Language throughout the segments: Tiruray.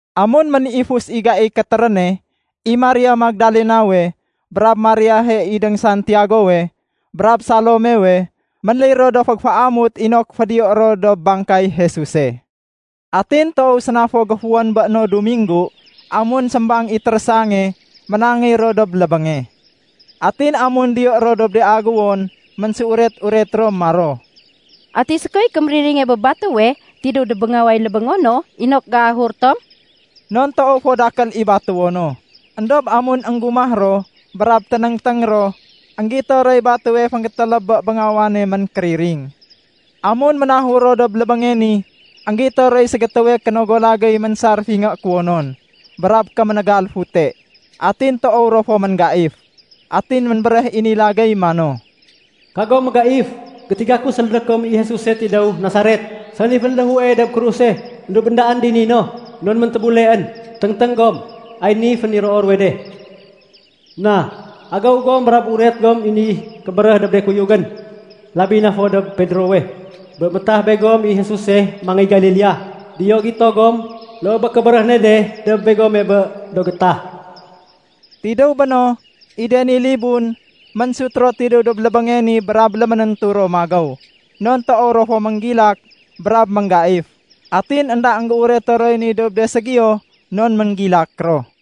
Amun ménifus i gaiy kétéréne, i Maria Magdalenawe, brab Mariahe idéng Santiagowe, brab Salomewe, ménléy ro do fégéféamut inok fédiyoé ro dob bangkay Jesuse. Atin toow séna fo géfuwén bé no Duminggu, amun sémbang i térésange, ménangéy ro dob lébénge. Atin amun diyo ro dob de aguwon, ménséuret-uret ro maro, “Ati sékoy kémériringe bé batéwe tidéw dob béngaway lébéngo no inok géahur tom?” Non toow fo dakél i batéwo no. Endob amun énggumah ro, brab ténéngténg ro, énggito roy batéwe fénggétéléb bé béngawane ménkériring. Amun ménahur ro dob lébénge ni, énggito roy ségétéwe kénogo lagéy ménsar fingé kuwonon, brab kéménégal fute. Atin toow ro fo ménggaif. Atin ménbéréh i ni lagéy mano, “Kagom mégaif. Gétiga ku sélédé kom i Jesuse tidéw Nasaret, sani fénléhue dob kruse. Endob éndaén dini no, non méntébuleén. Téngténg gom, ay ni féniroo ruwe de. Na, agéw gom, brab uret gom i ni kébéréh dob de kuyugén labi na fo dob Pedrowe, bé métah begom i Jesuse mangéy Galilea. Diyo gito gom, loo bé kébéréh ne de dob begome bé do gétah.” Tidéw béno, i de ni libun, ménsut ro tidéw dob lébénge ni brab léménéntu ro magéw. Non toow ro fo ménggilak brab ménggaif. Atin énda énggéureto roy ni dob de ségiyo non ménggilak ro.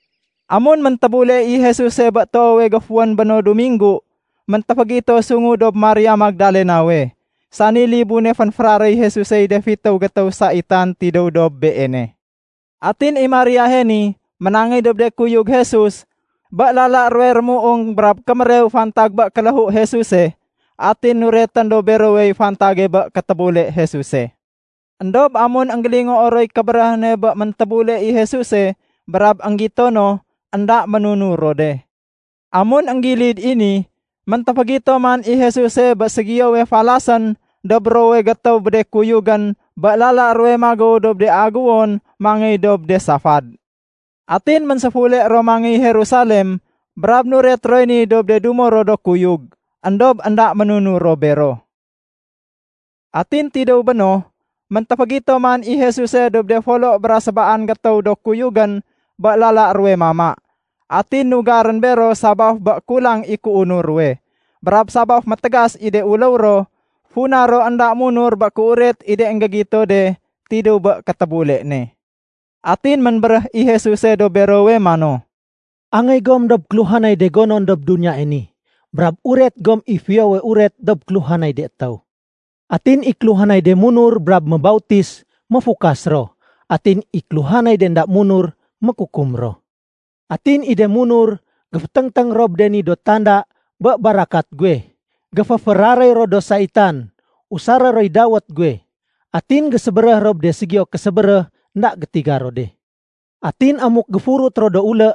Amun méntébule i Jesuse bé toowe géfuwén bé no Duminggu, méntéfégito sungu dob Maria Magdalenawe, sani libune fénféraréy Jesusey de fitéw gétéw saitan tidéw dob beene. Atin i Mariahe ni, ménangéy dob de kuyug Jesus, bé lala ruwe rémuung brab kémérew fantag bé kéléhu Jesuse. Atin nuretén dob berowey fantage bé kétébule Jesuse. Endob amun énggélingoo roy kébéréh ne bé méntébule i Jesuse brab énggito no, énda ménunur ro de. Amun énggilid i ni, méntéfégito man i Jesuse bé ségiyowe falasén dob ruwowe gétéw bé de kuyugén bé lala ruwe magéw dob de aguwon mangéy dob de safad. Atin ménséfule ro mangéy Jerusalem brab nuret roy ni dob de dumo ro do kuyug. Endob énda ménunur ro bero. Atin tidéw béno, méntéfégito man i Jesuse dob de folo bra sébaan gétéw do kuyugén bé lala ruwe mama. Atin nugarén bero sabaf bé kulang i kéunur ruwe, brab sabaf métégas i de uléw ro funa ro énda munur bé kéuret i de énggégito de tidéw bé kétébule ne. Atin ménbéréh i Jesuse dob berowe mano, “Angéy gom dob kéluhanay de gonon dob duniyae ni, brab uret gom i Fiyowe Uret dob kéluhanay de étéw. Atin i kéluhanay de munur brab mébautis, méfukas ro. Atin i kéluhanay de énda munur, mékukum ro. Atin i de munur géféténgténg ro bé de ni do tanda bé barakat guwe: Géféféraréy ro do saitan, usaré roy dawét guwe. Atin gésébéréh ro bé de ségiyo késébéréh énda gétiga ro de. Atin amuk géfurut ro do ulé,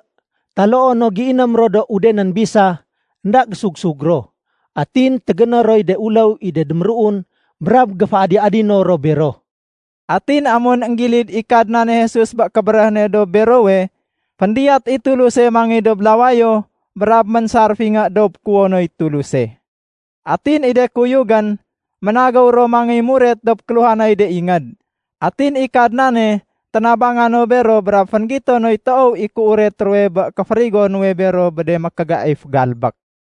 taloo no géiném ro udenén bisa, énda gésug-sug ro. Atin tégéné roy de uléw i de déméruun brab géféadi-adino ro bero.” Atin amun énggilid i Kadnane Jesus bé kébéréh ne dob berowe, féndiyat i Tuluse mangéy dob lawayo brab ménsar fingé dob kuwonoy Tuluse. Atin i de kuyugén ménagéw ro mangéy muret dob kéluhanay de ingéd. Atin i Kadnane ténabanga no bero brab fénggito noy toow i kéuret ruwe bé kéférigo nuwe bero bé de mékégaif galbék.